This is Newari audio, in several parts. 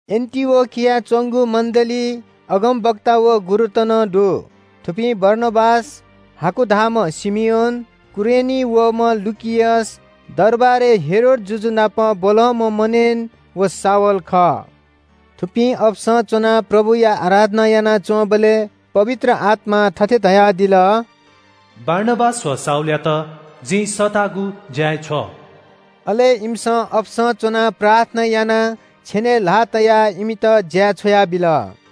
एन्‍टिओखियाय् च्‍वंगु मण्‍डलीइ अगमवक्ता व गुरुत नं दु। थुपिं बारनाबास, हाकु धाःम्‍ह शिमियोन, कुरेनीं वःम्‍ह लुकियस, दरबारय् हेरोद जुजु नाप ब्‍वलंम्‍ह मनेन व शाऊल खः। थुपिं अपसं च्‍वनाः प्रभुया आराधना यानाच्‍वंबलय् पवित्र आत्‍मां थथे धयादिल – “बारनाबास व शाऊलयात जिं सःतागु ज्‍याय् छ्व।” अले इमिसं अपसं च्‍वनाः प्रार्थना यानाः छेनय् ल्‍हाः तयाः इमित ज्‍याय् छ्वयाबिल।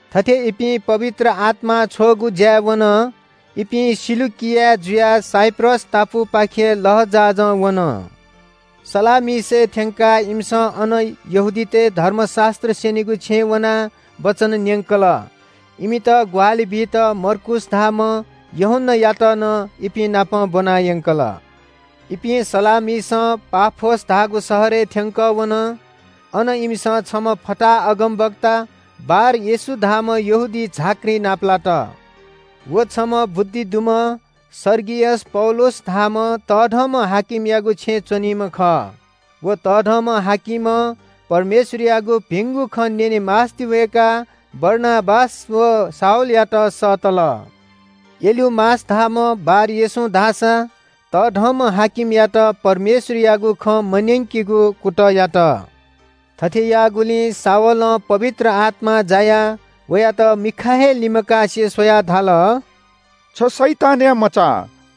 थथे इपिं पवित्र आत्‍मां छ्वःगु ज्‍याय् वन। इपिं सिलुकिया जुयाः साइप्रस टापुपाखे लःजहाजं वन। सलामिसय् थ्‍यंकाः इमिसं अन यहूदीतय् धर्मशास्‍त्र स्‍यनीगु छेँय् वनाः वचन न्‍यंकल। इमित ग्‍वाहालि बीत मर्कूस धाःम्‍ह यूहन्‍नायात नं इपिं नाप ब्‍वनायंकल। इपिं सलामिसं पाफोस धाःगु शहरय् थ्‍यंकः वन। अन इमिसं छम्‍ह फताहा अगमवक्ता बार-येशू धाःम्‍ह यहूदी झाँक्री नापलात। व छम्‍ह बुद्धि दुम्‍ह सर्गियस पौलुस धाःम्‍ह तःधंम्‍ह हाकिमयागु छेँय् च्‍वनीम्‍ह खः। व तःधंम्‍ह हाकिमं परमेश्‍वरयागु भिंगु खँ न्‍यने मास्‍ति वय्‌काः बारनाबास व शाऊलयात सःतल। एलुमास धाःम्‍ह बार-येशूं धाःसा तःधंम्‍ह हाकिमयात परमेश्‍वरयागु खँ मन्‍यंकेगु कुतः यात। थथे याःगुलिं शाऊलं (वयात पावल नं धाः) पवित्र आत्‍मां जायाः वयात मिखा हे लिमकासे स्‍वयाः धाल – “छ शैतानया मचा,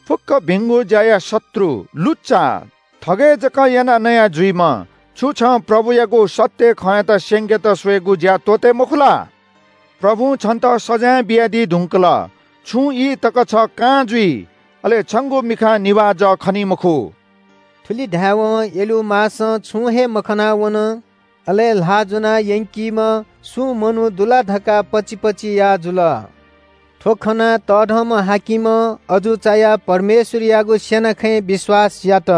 फुक्‍क भिंगु ज्‍याया शत्रु, लुच्‍चा, थगय् जक यानाः नया जुइम्‍ह, छु छं प्रभुयागु सत्‍य खँयात स्‍यंकेत स्‍वयेगु ज्‍या त्‍वःते मखु ला? प्रभुं छन्‍त सजाँय बियादी धुंकल। छुं ई तक छ कां जुइ। अले छंगु मिखां निभाः जः खनी मखु।” थुलि धायेवं एलुमासं छुं हे मखना वन। अले ल्‍हाः ज्‍वना यंकीम्‍ह सुं मनू दु ला धकाः पचिपचि याः जुल। थ्‍व खनाः तःधंम्‍ह हाकिमं अजू चायाः परमेश्‍वरयागु स्‍यना खँय् विश्‍वास यात।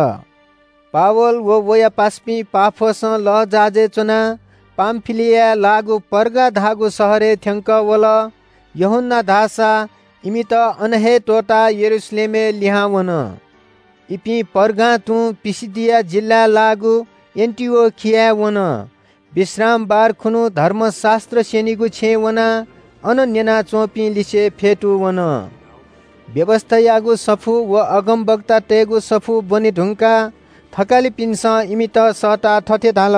पावल व वया पासापिं पाफोसं लःजहाजय् च्‍वनाः पामफिलियाय् लाःगु पर्गा धाःगु शहरय् थ्‍यंकः वल। यूहन्‍ना धाःसा इमित अन हे त्‍वःताः यरूशलेमय् लिहां वन। इपिं पर्गां तुं पिसिदिया जिल्‍लाय् लाःगु एन्‍टिओखियाय् वन। विश्रामबार खुन्‍हु धर्मशास्‍त्र स्‍यनीगु छेँय् वनाः अन न्‍यना च्‍वंपिं लिसे फ्‍यतूवन। व्‍यवस्‍थायागु सफू व अगमवक्तातय्‌गु सफू ब्‍वने धुंकाः थकालिपिन्‍सं इमित सःताः थथे धाल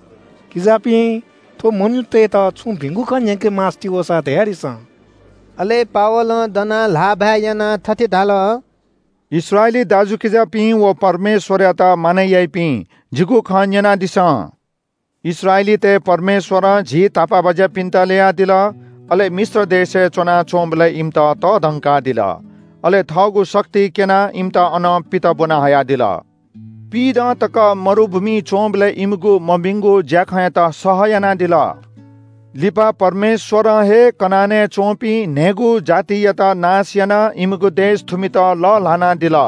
– “किजापिं, थ्‍व मनूतय्‌त छुं भिंगु खँ न्‍यंके मास्‍ति वःसा, धयादिसँ।” अले पावलं दनाः ल्‍हाःभाय् यानाः थथे धाल – “इस्राएली दाजुकिजापिं व परमेश्‍वरयात मानय् याइपिं, जिगु खँ न्‍यनादिसँ। “इस्राएलीतय् परमेश्‍वरं झी तापाःबाज्‍यापिन्‍त ल्‍ययादिल, अले मिश्र देशय् च्‍वनाच्‍वंबलय् इमित तःधंकादिल। अले थःगु शक्ति क्‍यनाः इमित अनं पित ब्‍वना हयादिल। पिइदँ तक मरुभूमिइ च्‍वंबलय् इमिगु मभिंगु ज्‍याखँयात सह यानादिल। लिपा परमेश्‍वरं हे कनानय् च्‍वंपिं न्‍हय्‌गू जातियात नाश यानाः इमिगु देश थुमित लःल्‍हानादिल।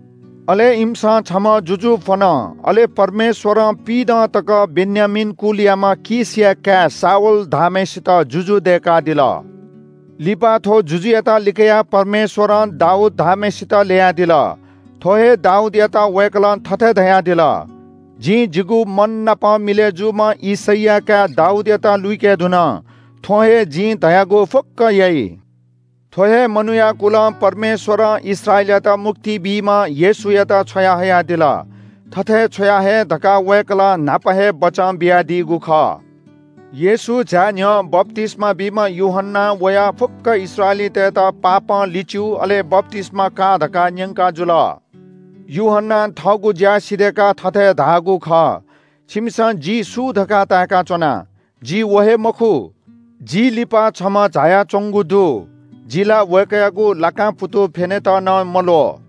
अले इमिसं छम्‍ह जुजु फ्‍वन। अले परमेश्‍वरं पिइदँ तक बेन्‍यामीन कुलयाम्‍ह कीशया काय् शाऊल धाःम्‍हय्‌सित जुजु दय्‌कादिल। लिपा थ्‍व जुजुयात लिकयाः परमेश्‍वरं दाऊद धाःम्‍हय्‌सित ल्‍ययादिल। थ्‍व हे दाऊदयात वय्‌कलं थथे धयादिल – ‘जिं जिगु मन नाप मिलय् जूम्‍ह यिशैया काय् दाऊदयात लुइके धुन। थ्‍वं हे जिं धयागु फुक्‍क याइ।’ “थ्‍व हे मनूया कुलं परमेश्‍वरं इस्राएलयात मुक्ति बीम्‍ह येशूयात छ्वयाहयादिल। थथे छ्वयाहये धकाः वय्‌कलं न्‍हापा हे बचं बियादीगु खः। येशू झाये न्‍ह्यः बप्‍तिस्‍मा बीम्‍ह यूहन्‍नां वयाः फुक्‍क इस्राएलीतय्‌त पश्‍चाताप या अले बप्‍तिस्‍मा का धकाः न्‍यंकाजुल। यूहन्‍नां थःगु ज्‍या सिधय्‌काः थथे धाःगु खः – ‘छिमिसं जि सु धकाः ताय्‌का च्‍वना? जि व हे मखु। जि लिपा छम्‍ह झायाच्‍वंगु दु। जि ला वय्‌कःयागु लाकां पुतु फ्‍यनेत नं मल्‍वः।’”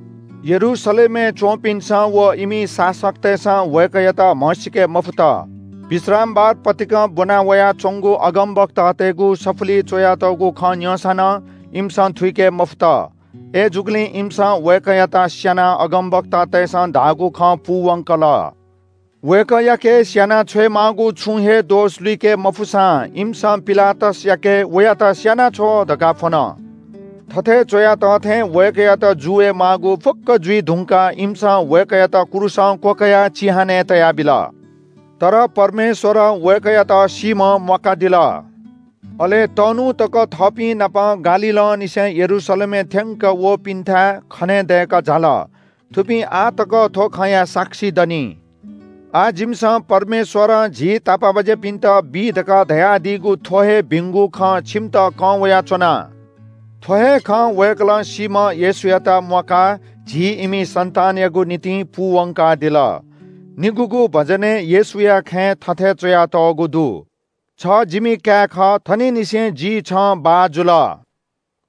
यरूशलेमय् च्‍वंपिन्‍सं व इमि शासकतय्‌सं वय्‌कःयात म्‍हसीके मफुत। विश्रामबार पतिकं ब्‍वना वयाच्‍वंगु अगमवक्तातय्‌गु सफुलिइ च्‍वयातःगु खँ न्‍यंसां नं इमिसं थुइके मफुत। अय्‌जूगुलिं इमिसं वय्‌कःयात स्‍यानाः अगमवक्तातय्‌सं धाःगु खँ पूवंकल। वय्‌कःयाके स्‍याना छ्वयेमाःगु छुं हे दोष लुइके मफुसां इमिसं पिलातसयाके ‘वयात स्‍यानाछ्व’ धकाः फ्‍वन। “थथे च्‍वया तः थें वय्‌कःयात जू वये माःगु फुक्‍क जुइ धुंकाः इमिसं वय्‌कःयात क्रूसं क्‍वकयाः चिहानय् तयाबिल। तर परमेश्‍वरं वय्‌कःयात सीम्‍हं म्‍वाकादिल। अले तःन्‍हु तक थःपिं नाप गालीलंनिसें यरूशलेमय् थ्‍यंक वःपिन्‍थाय् खनेदय्‌कः झाल। थुपिं आः तक थ्‍व खँया साक्षी दनि। “आः जिमिसं परमेश्‍वरं झी तापाःबाज्‍यापिन्‍त बी धकाः धयादीगु थ्‍व हे भिंगु खँ छिमित कं वयाच्‍वना। थ्‍व हे खँ वय्‌कलं सीम्‍ह येशूयात म्‍वाकाः झी इमि सन्‍तानयागु निंतिं पूवंकादिल। निगूगु भजनय् येशूया खँय् थथे च्‍वयातःगु दु – “‘छ जिमि काय् खः। थनिंनिसें जि छं बाः जुल।’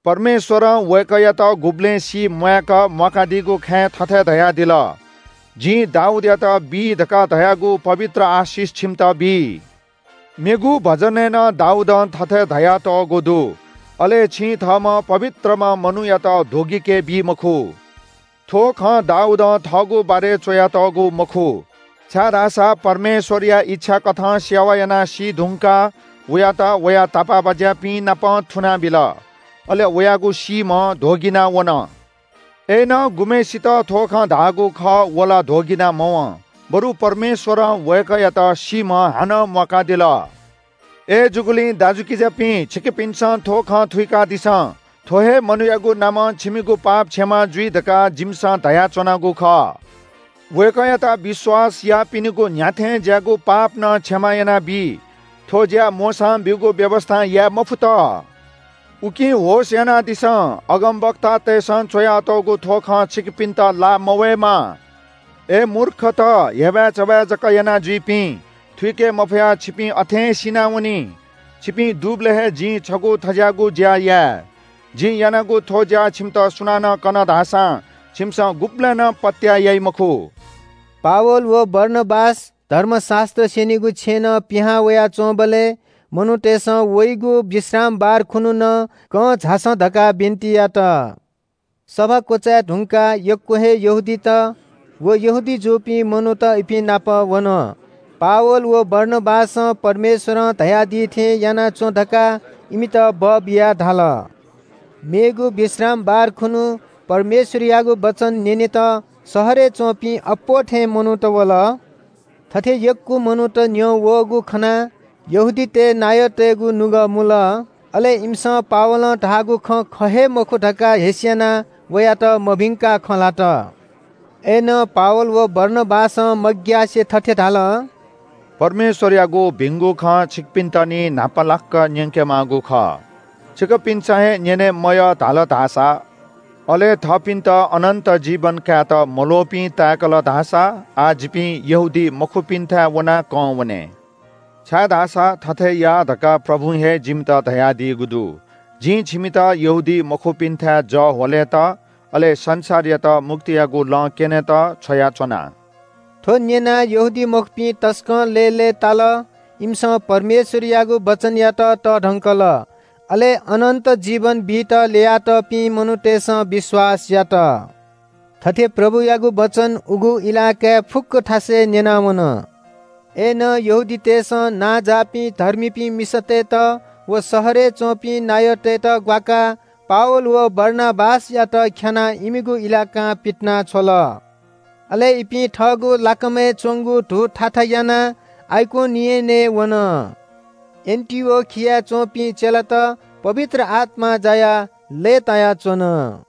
“परमेश्‍वरं वय्‌कःयात गुबलें सीम्‍वाय्‌क म्‍वाकादीगु खँय् थथे धयादिल – “‘जिं दाऊदयात बी धकाः धयागु पवित्र आशिष छिमित बी।’ “मेगु भजनय् नं दाऊदं थथे धयातःगु दु – “‘अले छिं थःम्‍ह पवित्रम्‍ह मनूयात ध्‍वगिकेबी मखु।’ “थ्‍व खँ दाऊदं थःगु बारे च्‍वयातःगु मखु, छाय्‌धाःसा परमेश्‍वरया इच्‍छा कथं सेवा यानाः सीधुंकाः वयात वया तापाःबाज्‍यापिंनापं थुनाबिल। अले वयागु सीम्‍ह ध्‍वगिना वन। अय्‌नं गुम्‍हय्‌सित थ्‍व खँ धाःगु खः व ला ध्‍वगिना मवं, बरु परमेश्‍वरं वय्‌कःयात सीम्‍हं हानं म्‍वाकादिल। “अय्‌जूगुलिं दाजुकिजापिं, छिकपिन्‍सं थ्‍व खँ थुइकादिसँ। थ्‍व हे मनूयागु नामं छिमिगु पाप क्षमा जुइ धकाः जिमिसं धयाच्‍वनागु खः। वय्‌कःयात विश्‍वास याःपिनिगु न्‍ह्याथें ज्‍याःगु पाप नं क्षमा यानाबी। थ्‍व ज्‍या मोशां ब्‍यूगु व्‍यवस्‍थां याये मफुत। उकिं होश यानादिसँ। अगमवक्तातय्‌सं च्‍वयातःगु थ्‍व खँ छिकपिन्‍त लाः मवयेमा – “‘अय् मूर्खत, हेबाय्‌चबाय् जक यानाजुइपिं, थुइके मफयाः छिपिं अथें सिनावनी। छिपिं दुबलय् हे जिं छगू थज्‍याःगु ज्‍या याये। जिं यानागु थ्‍व ज्‍या छिमित सुनानं कन धाःसां छिमिसं गुबलें नं पत्‍याः याइ मखु।’” पावल व बारनाबास धर्मशास्‍त्र स्‍यनीगु छेँनं पिहां वयाच्‍वंबलय् मनूतय्‌सं वइगु विश्रामबार खुन्‍हु नं कं झासँ धकाः बिन्‍ति यात। सभा क्‍वचाय् धुंकाः यक्‍व हे यहूदीत व यहूदी जूपिं मनूत इपिं नाप वन। पावल व बारनाबासं परमेश्‍वरं धयादी थें याना च्‍वँ धकाः इमित बःबियाः धाल। मेगु विश्रामबार खुन्‍हु परमेश्‍वरयागु वचन न्‍यनेत शहरय् च्‍वंपिं अप्‍वः थें मनूत वल। थथे यक्‍व मनूत न्‍यं वःगु खनाः यहूदीतय् नायःतय्‌गु नुगः मुल। अले इमिसं पावलं धाःगु खँ ख हे मखु धकाः हेस्‍यानाः वयात मभिंकाः खँ ल्‍हात। अय्‌नं पावल व बारनाबासं मग्‍यासे थथे धाल – “परमेश्‍वरयागु भिंगु खँ छिकपिन्‍त निं न्‍हापालाक न्‍यंके माःगु खः। छिकपिन्‍सं हे न्‍यने मयः धाल धाःसा, अले थःपिन्‍त अनन्‍त जीवन कायेत मल्‍वःपिं ताय्‌कल धाःसा आः जिपिं यहूदीमखुपिन्‍थाय् वनाः कं वने। छाय्‌धाःसा थथे या धकाः प्रभुं हे जिमित धयादीगु दु – “‘जिं छिमित यहूदीमखुपिन्‍थाय् जः ह्वलेत, अले संसारयात मुक्तियागु लँ क्‍यनेत छ्वयाच्‍वना।’” थ्‍व न्‍यनाः यहूदीमखुपिं तसकं लय्‌लय्‌ताल। इमिसं परमेश्‍वरयागु वचनयात तःधंकल। अले अनन्‍त जीवन बीत ल्‍ययातःपिं मनूतय्‌सं विश्‍वास यात। थथे प्रभुयागु वचन उगु इलाकाय् फुक्‍क थासय् न्‍यनावन। अय्‌नं यहूदीतय्‌सं नांजाःपिं धर्मीपिं मिसातय्‌त व शहरय् च्‍वंपिं नायःतय्‌त ग्‍वाकाः पावल व बारनाबासयात ख्‍यानाः इमिगु इलाकां पितिनाछ्वल। अले इपिं थःगु लाकामय् च्‍वंगु धू थाथा यानाः आइकोनियनय् वन। एन्‍टिओखियाय् च्‍वंपिं चेलात पवित्र आत्‍मां जायाः लय्‌तायाच्‍वन।